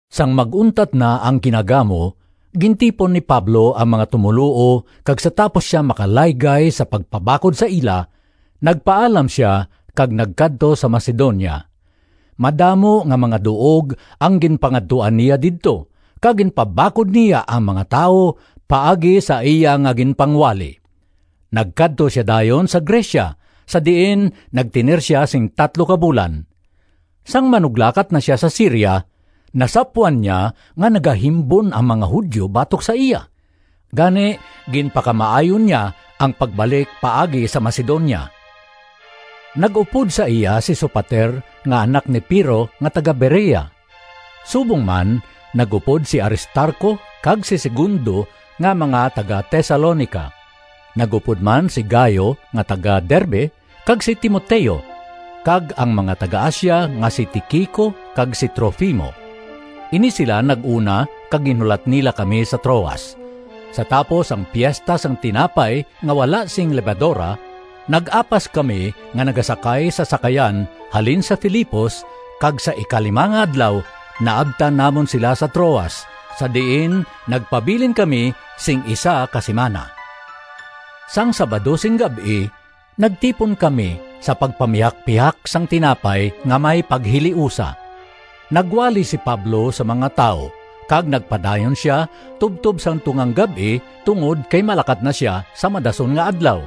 Sang mag-untat na ang kinagamo, gintipon ni Pablo ang mga tumoluo kag sa tapos sia makalaygay sa pagpabakod sa ila, nagpaalam sia kag nagkadto sa Macedonia. Madamo nga mga duog ang ginpangadtuan niya didto kag ginpabakod niya ang mga tawo paagi sa iya nga ginpangwali. Nagkadto sia dayon sa Grecia, sa diin nagtener sia sing tatlo ka bulan. Sang manuglakat na sia sa Siria, nasapwan niya nga nagahimbon ang mga Judio batok sa iya, gani ginpakamaayo niya ang pagbalik paagi sa Macedonia. Nag-upod sa iya si Sopater nga anak ni Pirro nga taga-Berea. Subong man nag-upod si Aristarco kag si Segundo nga mga taga-Tesalonica. Nag-upod man si Gayo nga taga-Derbe, kag si Timoteo, kag ang mga taga-Asia nga si Tiquico kag si Trofimo. Ini sila nag-una kag ginhulat nila kami sa Troas. Sa tapos ang Piesta sang Tinapay nga wala sing Lebadora, nag-apas kami nga nagasakay sa sakayan halin sa Filipos kag sa ikalima nga adlaw naabtan namon sila sa Troas, sa diin nagpabilin kami sing isa ka simana. Sang Sabado sing gab-i nagtipon kami sa pagpamihakpihak sang tinapay nga may paghiliusa. Nagwali si Pablo sa mga tawo kag nagpadayon sia tubtob sang tungang gab-i tungod kay malakat na sia sa madason nga adlaw.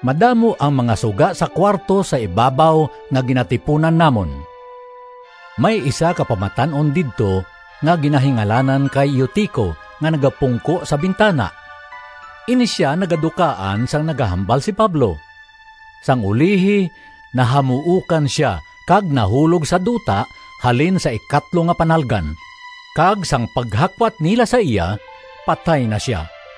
Madamo ang mga suga sa kuwarto sa ibabaw nga ginatipunan namon. May isa ka pamatan-on didto nga ginahingalanan kay Eutico nga nagapungko sa bintana. Ini sia nagadukaan sang nagahambal si Pablo. Sang ulihi nahamuokan sia kag nahulog sa duta halin sa ikatlo nga panalgan. Kag sang paghakwat nila sa iya patay na sia.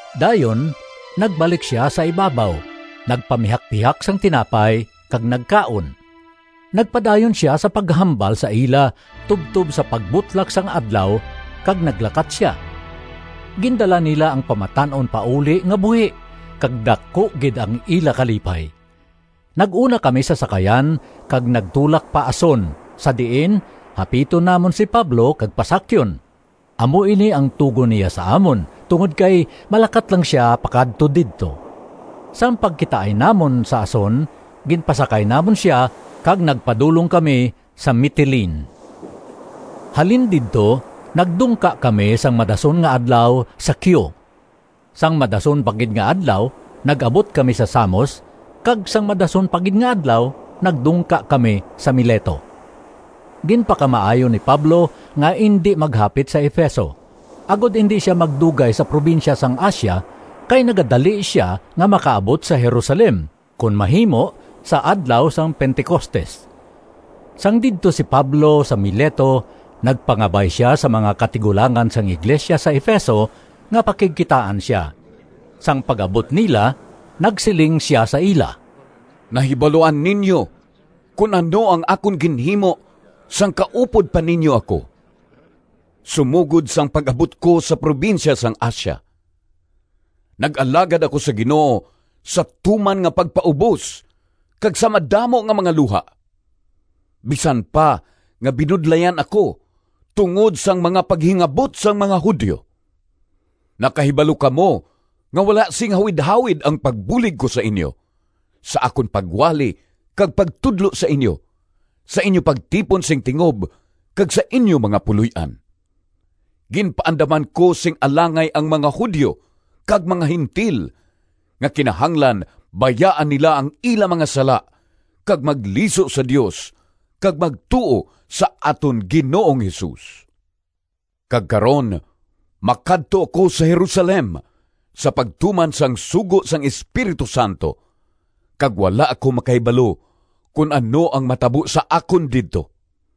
Dayon nagbalik sia sa ibabaw, nagpamihakpihak sang tinapay kag nagkaon. Nagpadayon sia sa paghambal sa ila tubtob sa pagbutlak sang adlaw kag naglakat sia. Gindala nila ang pamatan-on pauli nga buhi kag daku gid ang ila kalipay. Nag-una kami sa sakayan kag nagtulak pa Ason sa diin hapiton namon si Pablo kag pasakyon. Amo ini ang tugon niya sa amon tungod kay malakat lang sia pakadto didto. Sang pagkitaay namon sa Ason ginpasakay namon sia kag nagpadulong kami sa Mitilene. Halin didto nagdungka kami sang madason nga adlaw sa Quio. Sang madason pa gid nga adlaw nag-abot kami sa Samos kag sang madason pa gid nga adlaw nagdungka kami sa Mileto. Ginpakamaayo ni Pablo nga indi maghapit sa Efeso, agod indi sia magdugay sa probinsya sang Asia kay nagadali sia nga makaabot sa Jerusalem, kon mahimo, sa adlaw sang Pentecostes. Sang didto si Pablo sa Mileto nagpangabay sia sa mga katigulangan sang iglesia sa Efeso nga pakigkitaan sia. Sang pag-abot nila nagsiling sia sa ila, “Nahibaluan ninyo kon ano ang akon ginhimo sang kaupod pa ninyo ako, sumogod sang pag-abot ko sa probinsya sang Asia. Nag-alagad ako sa Ginoo sa tuman nga pagpaubos kag sa madamo nga mga luha, bisan pa nga binudlayan ako tungod sang mga paghingabot sang mga Judio. Nakahibalo kamo nga wala sing hawidhawid ang pagbulig ko sa inyo sa akon pagwali kag pagtudlo sa inyo, sa inyo pagtipon sing tingob kag sa inyo mga puloy-an. Ginpaandaman ko sing alangay ang mga Judio kag mga Gentil nga kinahanglan bayaan nila ang ila mga sala kag magliso sa Dios kag magtuo sa aton Ginoong Jesus. Kag karon makadto ako sa Jerusalem sa pagtuman sang sugo sang Espiritu Santo kag wala ako makahibalo kon ano ang matabo sa akon didto.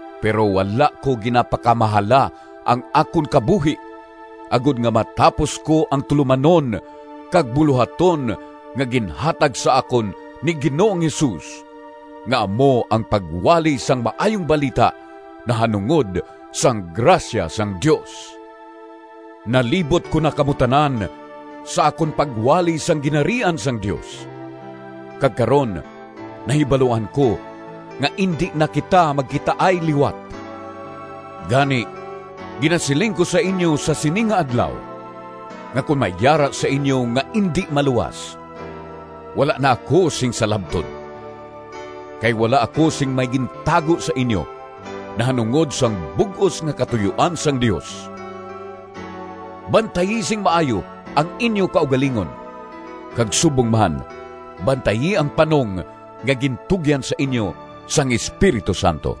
Pero wala ko ginapakamahala ang akon kabuhi agod nga matapos ko ang tulomanon kag bulohaton nga ginhatag sa akon ni Ginoong Jesus nga amo ang pagwali sang Maayong Balita nahanungod sang grasya sang Dios. “Nalibot ko na kamo tanan sa akon pagwali sang Ginharian sang Dios. Kag karon nahibaluan ko nga indi na kita magkitaay liwat. Gani ginasiling ko sa inyo sa sini nga adlaw nga kon may yara sa inyo nga indi maluwas, wala na ako sing salabton. Kay wala ako sing may gintago sa inyo nahanungod sang bug-os nga katuyoan sang Dios. Bantayi sing maayo ang inyo kaugalingon kag subong man bantayi ang panong nga gintugyan sa inyo sang Espiritu Santo.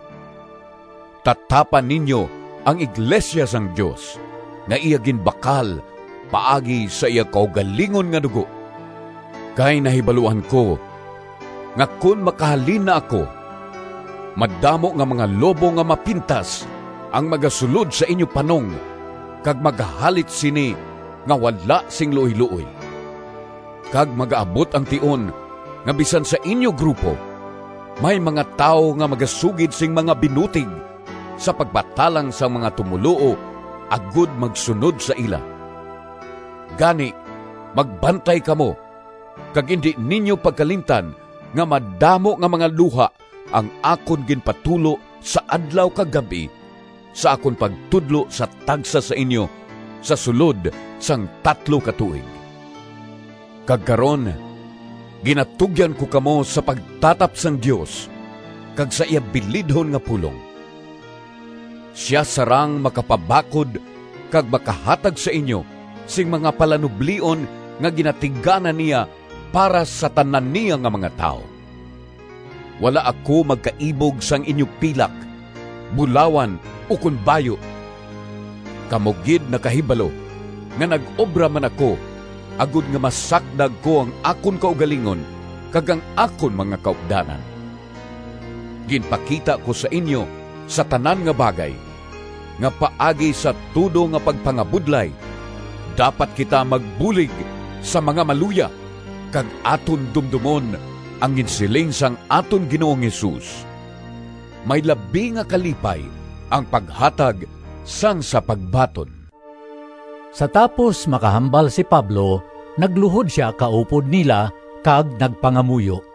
Tatapa ninyo ang iglesia sang Dios nga iya ginbakal paagi sa iya kaugalingon nga dugo. Kay nahibaluan ko nga kon makahalin na ako, madamo nga mga lobo nga mapintas ang magasulod sa inyo panong kag magahalit sini nga wala sing luoyluoy. Kag magaabot ang tion nga bisan sa inyo grupo may mga tawo nga magasugid sing mga binutig sa pagpatalang sang mga tumoluo agod magsunod sa ila. Gani, magbantay kamo, kag indi ninyo pagkalimtan nga madamo nga mga luha ang akon ginpatulo sa adlaw kag gab-i sa akon pagtudlo sa tagsa sa inyo sa sulod sang tatlo ka tuig. “Kag karon ginatugyan ko kamo sa pagtatap sang Dios kag sa iya bilidhon nga pulong. Sia sarang makapabakod kag makahatag sa inyo sing mga palanublion nga ginatigana niya para sa tanan niya nga mga tawo. Wala ako magkaibog sang inyo pilak, bulawan ukon bayu. Kamo gid nakahibalo nga nag-obra man ako agod nga masakdag ko ang akon kaugalingon kag ang akon mga kaupdanan. Ginpakita ko sa inyo sa tanan nga bagay, nga paagi sa tudo nga pagpangabudlay dapat kita magbulig sa mga maluya kag aton dumdomon ang ginsiling sang aton Ginoong Jesus, ‘May labi nga kalipay ang paghatag sang sa pagbaton.’” Sa tapos makahambal si Pablo, nagluhod sia kaupod nila kag nagpangamuyo.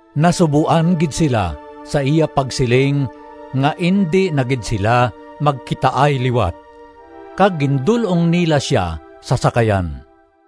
Nasuboan gid sila sa iya pagsiling nga indi na gid sila magkitaay liwat. Kag gindul-ong nila sia sa sakayan.